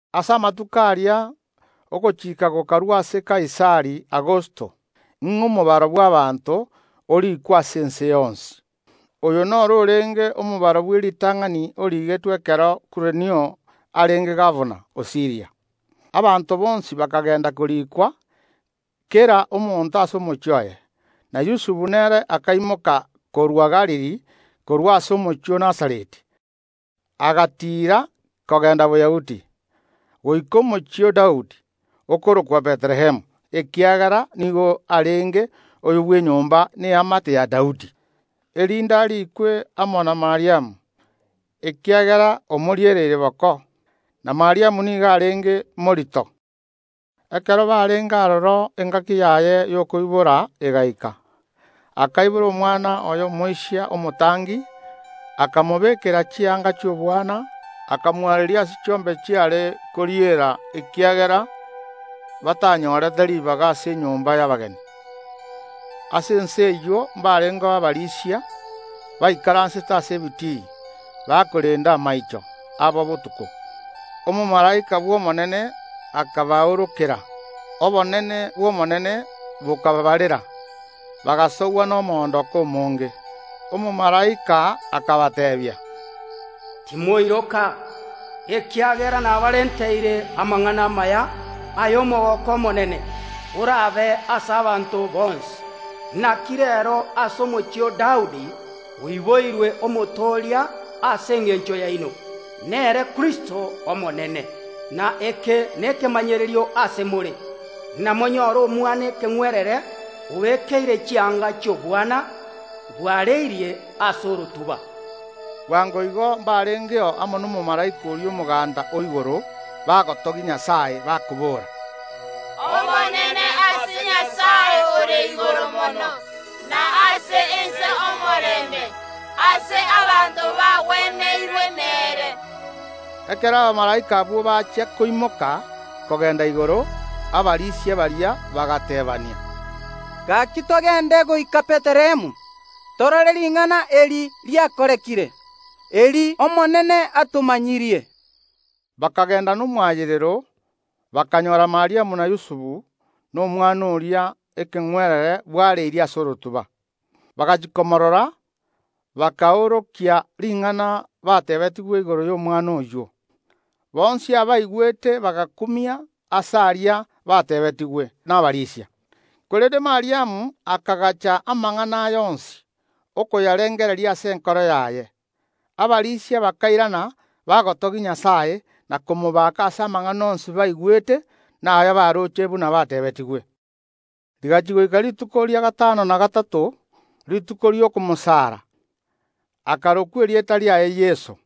Ase amatuko aria, ogochika gokarua ase Kaisari Augusto, ng’a omobaro bw’abaanto oriikwe ase ense yonsi. Oyo noro orenge omobaro bw’eritang’ani oriigetwe ekero Kurenio arenge gabana o Siiria. Abanto bonsi bakagenda koriikwa, kera omonto ase omochie oye. Na Yusufu nere akaimoka korwa Galili korwa ase omochie o Nazareti, agatiira kogenda Boyahudi, goika Omochie o Daudi, okorokwa Bethlehemu, ekiagera nigo arenge oyo bw’enyomba na eamate ya Daudi, erinde ariikwe amo na Mariamu, ekiagera konya omoriereire boko, na Mariamu nigo arenge morito. Ekero barenge aroro engaki yaye y’okoibora egaika. Akaibora omwana oye omoisia omotangi, akamobekera chianga chi’obwana, akamwareria ase orotuba chiombe chiare koriera, ekiagera batanyorete ribaga ase enyomba y’abageni. Ase ense eyio mbarengeo abarisia baikaransete ase ebitii, bakorenda amaicho abo botuko. Omomalaika bw’Omonene akabaorokera, na obonene bw’Omonene bokabaabarera; bagasogwa nomoondoko omonge. Omomalaika akabateebia, “Timoiroka, ekiagera nabarenteire amang’ana amaya ay’omogooko omonene, oraabe ase abanto bonsi, naki reero ase Omochie o Daudi oiboirwe Omotooria ase engencho yaino, nere Kristo Omonene. Na eke nekemanyererio ase more: Namonyore omwana ekeng’werere obekeire chianga chi’obwana, bwareirie ase orotuba.” Bwango igo mbarengeo amo nomomalaika oria omoganda o igoro, bagotogia Nyasae, bakoboora, “Obonene ase Nyasae ore Igoro Mono, na ase ense omorembe, ase abanto abwo bancheirwe nere.” Ekero abamalaika abwo bachia koimoka kogenda igoro, abarisia baria bagateebania, “Gaki togende goika Bethlehemu, torore ring’ana eri riakorekire, eri Omonene atomanyirie.” Bakagenda nomoayerero, bakanyora Mariamu na Yusufu, na omwana oria ekeng’werere bwareirie ase orotuba. Bagachia komorora, bakaorokia ring’ana bateebetigwe igoro y’omwana oyio. Bonsi abaigwete bagakumia ase aria bateebetigwe nabarisia. Korende Mariamu akagacha amang’ana aya onsi, okoyarengereria ase enkoro yaye. Abarisia bakairana, bagotogia Nyasae na komobaka ase amang’ana onsi baigwete, na ayabaroche, buna bateebetigwe. Rigachia goika rituko ria gatano na gatato, rituko ri’okomwarokia, akarokwa erieta riaye Yeso,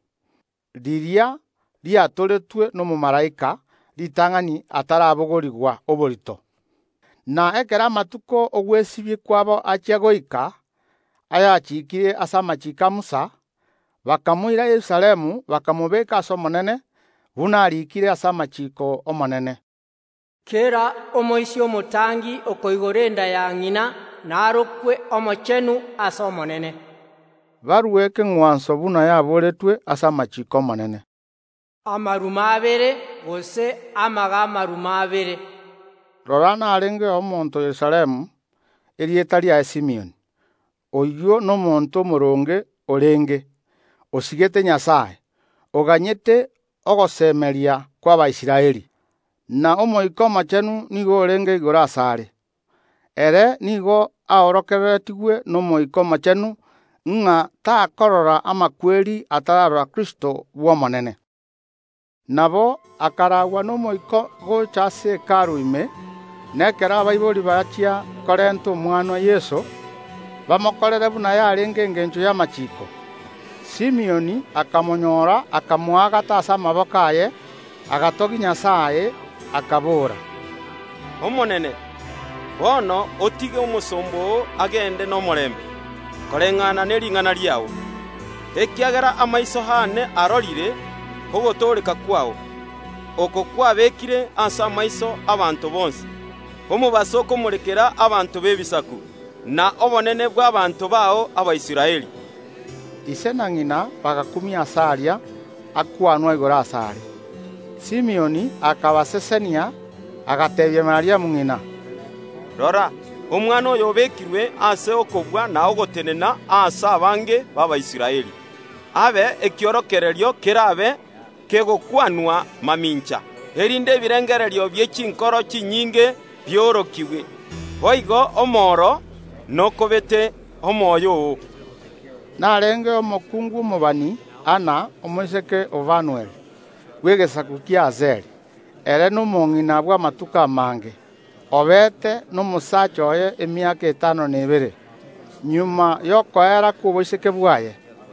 riria riatoretwe nomomalaika ritang’ani atarabogorigwa oborito. Na ekero amatuko ogwesibia kwabo achia goika, ayachikiire ase amachiiko a Musa, bakamoira Yerusalemu, bamobeke ase Omonene (buna ariikire ase amachiiko y’Omonene, “Kera omoisia omotangi okoigora enda ya ng’ina narokwe omochenu ase Omonene”), barue ekeng’wanso buna ariikire ase amachiiko o Omonene, “Amaruma abere, gose amage ’amaruma abere.” Rora narengeo omonto Yerusalemu, erieta riaye Simioni. Oyio nigo arenge omonto omooronge, na nigo asigete Nyasae, ere nigo aganyete ogosemeria kw’Abaisraeli; na Omoika Omochenu nigo orenge igoro asare. Ere nigo aorokereretigwe n’Omoika Omochenu, ng’a takorora amakweri atararora Kristo Omonene. Nabo akaraagwa n’Omoika gocha ase Hekalu ime; na ekero abaibori bachia korenta omwana Yeso, bamokorere buna yarenge engencho y’amachiiko, Simioni akamonyora, akamoagata ase amaboko aye, agatogia Nyasae, akabora, “Omonene, bono otige omosomba oo agende nomorembe, koreng’ana nering’ana riao. Ekiagera amaiso aane arorire ogotooreka kwao, oko kwabekire ase amaiso y’abanto bonsi, omobaso okomorekera abanto b’Ebisaku, na obonene bw’abaanto bao Abaisraeli.” Ise na ng’ina bagakumia ase aria akwanwa igoro asare. Simioni akabasesenia, agateebia Mariamu ng’ina, “Rora, Omwana oyo otenenigwe ase ogosira na ogotoreka ase abange b’Abaisraeli, abe ekiorokererio kerabe kegokwanwa mamincha, erinde ebirengererio bie chinkoro chinyinge biorokigwe. Boigo omoro nokobete omoyo oo.” Narengeo omokungu omobani, Anna, omoiseke o Fanueli, bw’egesaku ki’Asheri. Ere nomong’ina bw’amatuko amange, obete nomosaacha oye emiaka etano na ebere magega y’okoera kw’oboiseke bwaye.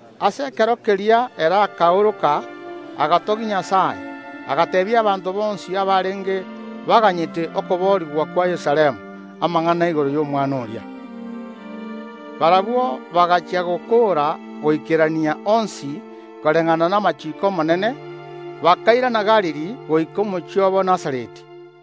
Ase ekero keria ere akaoroka, agatogia Nyasae, agateebia abanto bonsi abarenge baganyete okoboorigwa kwa Yerusalemu amang’ana igoro y’Omwana oria. Barabwo bagachia gokoora goikerania onsi koreng’ana namachiiko Omonene, bakairana Galili goika omochie obo Nazareti.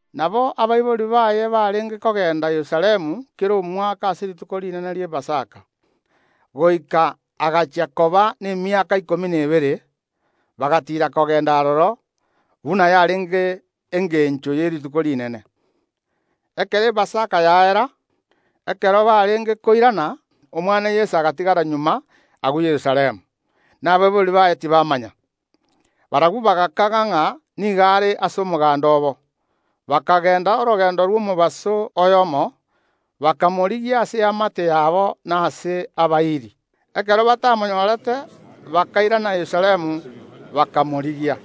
Nabo abaibori baye barenge kogenda Yerusalemu kera omwaka ase rituko rinene ri’Epasaka. Goika agachia koba nemiaka ikomi na ebere, bagatiira kogenda aroro, buna yarenge engencho ye Rituko Rinene. Ekero Epasaka yaera, ekero barenge koirana, omwana Yeso agatigara magega agwo Yerusalemu, na abaibori baye tibamanya. Barabwo bagakaga ng’a nigo are ase omoganda obo, bakagenda orogendo rw’omobaso oyomo, bakamorigia ase abairi babo boigo nabasani. Ekero batamonyorete, bakairana Yerusalemu, bakamorigia.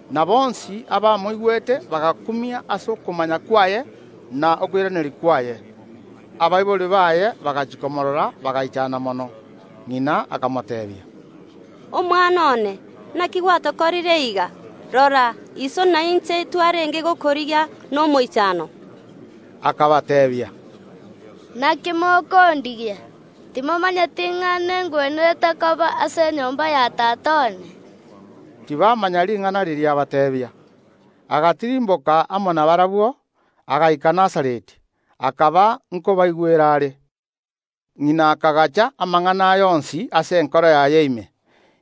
Na bonsi abamoigwete bagakumia ase okomanya kwaye na okoiraneria kwaye. Abaibori baye bagachia komoorora bagaichana mono. Ng’ina akamoteebia, “Omwana one, naki gwatokorire iga? Rora, iso na inche twarenge gokorigia nomoichano.” Akabateebia, “Naki mokondigia? Timomanyeti ng’a nengwenerete koba ase enyomba ya Tata one?” Tibamanya ring’ana riria abateebia. Agatirimboka amo nabarabwo, agaika Nazareti, akaba nkobaigwera are. Ng’ina akagacha amang’ana aya onsi ase enkoro yaye ime.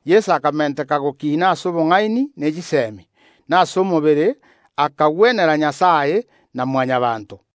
Yeso akamenteka gokina ase obong’aini ne chisemi, na ase omobere, akanyora ogwancherwa ase Nyasae na Mwanyabaanto.